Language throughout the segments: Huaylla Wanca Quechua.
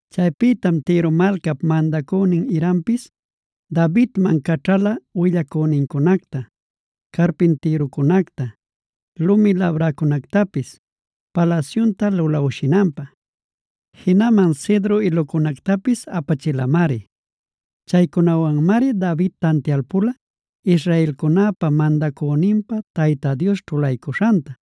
Chaypïtam Tiro malcap mandacünin Hirampis Davidman caćhala willacünincunacta, carpintïrucunacta, lumi labräcunactapis palasyunta lulawshinanpä; jinaman cedro ilucunactapis apachilamari. Chaycunawanmari David tantialpula israelcunäpa mandacüninpä Tayta Dios ćhulaycuśhanta.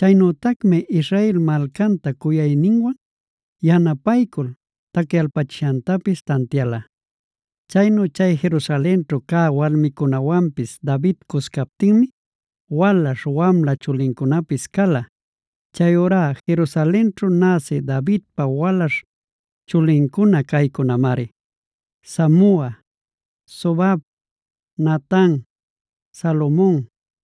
Chaynütacmi Israel malcanta cuyayninwan, yanapaycul tacyalpachishantapis tantiala. Chaynu chay Jerusalenćhu cä walmicunäwanpis David cuscaptinmi walaśh wamla chulincunapis cala. Chayurá Jerusalenćhu näsi Davidpa walaśh chulincuna caycunamari: Samua, Sobab, Natan, Salomon,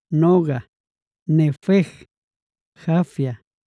Noga, Nefeg, Jafia,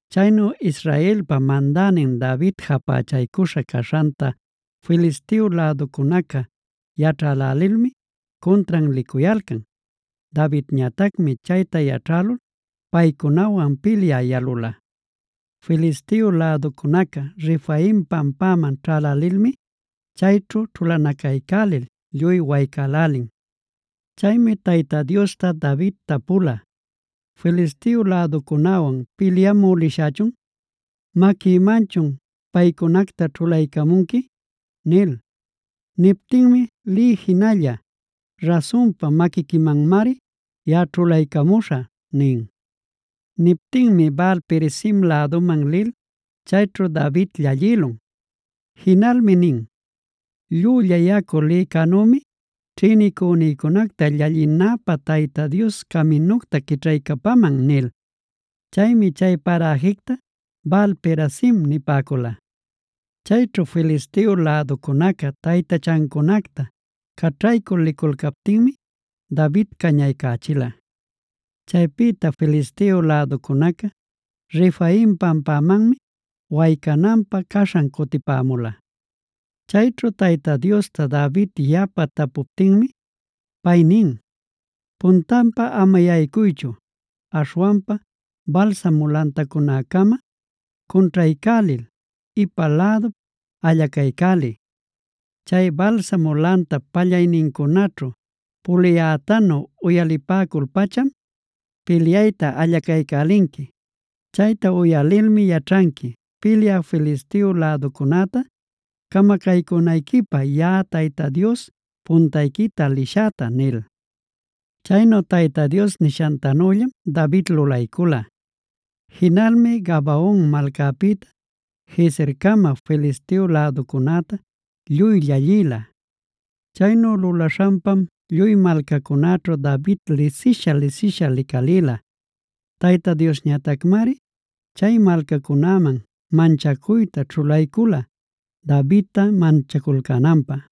Chaynu Israelpa mandänin David japächaycuśha caśhanta Filisteo läducunaca yaćhälälilmi cuntran licuyalcan. Davidñatacmi chayta yaćhälul paycunawan pilyä yalula. Filisteo läducunaca Refaim pampaman ćhälälilmi, chayćhu ćhulanacaycälil lluy waycälälin. Chaymi Tayta Diosta David tapula: “¿Filisteo läducunäwan pilyamü lishächun? ¿Maquïmanchun paycunacta ćhulaycamunqui?” nil. Niptinmi: “Liy jinalla. Rasunpa, maquiquimanmari yaꞌa ćhulaycamuśhä” nin. Niptinmi Baal-perazim läduman lil chayćhu David llallïlun. Jinalmi nin: “Llülla yacu lïcänümi ćhïnicünïcunacta llallinäpä Tayta Dios caminucta quićhaycapaman” nil. Chaymi chay paräjicta Baal-perazim nipäcula. Chayćhu Filisteo läducunaca taytachancunacta caćhaycul liculcaptinmi David cañaycächila. Chaypïta Filisteo läducunaca Refaim pampamanmi waycananpä caśhan cutipämula. Chayćhu Tayta Diosta David yapa tapuptinmi pay nin: “Puntanpa ama yaycuychu. Aśhwanpa balsamo lantacunäcama cunćhaycälil, ipan lädup allacaycäliy. Chay balsamo lantap pallaynincunaćhu puliyätanu uyalipäcul-pacham pilyayta allacaycälinqui. Chayta uyalilmi yaćhanqui, pilyä Filisteo läducunäta camacaycünayquipä yaꞌa Tayta Dios puntayquita lishäta” nil. Chaynu Tayta Dios nishantanüllam David lulaycula. Jinalmi Gabaon malcapïta Gezercama Filisteo läducunäta lluy llallïla. Chaynu lulaśhanpam lluy malcacunäćhu David lisisha-lisisha licalïla. Tayta Diosñatacmari chay malcacunäman manchacuyta ćhulaycula Davidta manchaculcänanpä.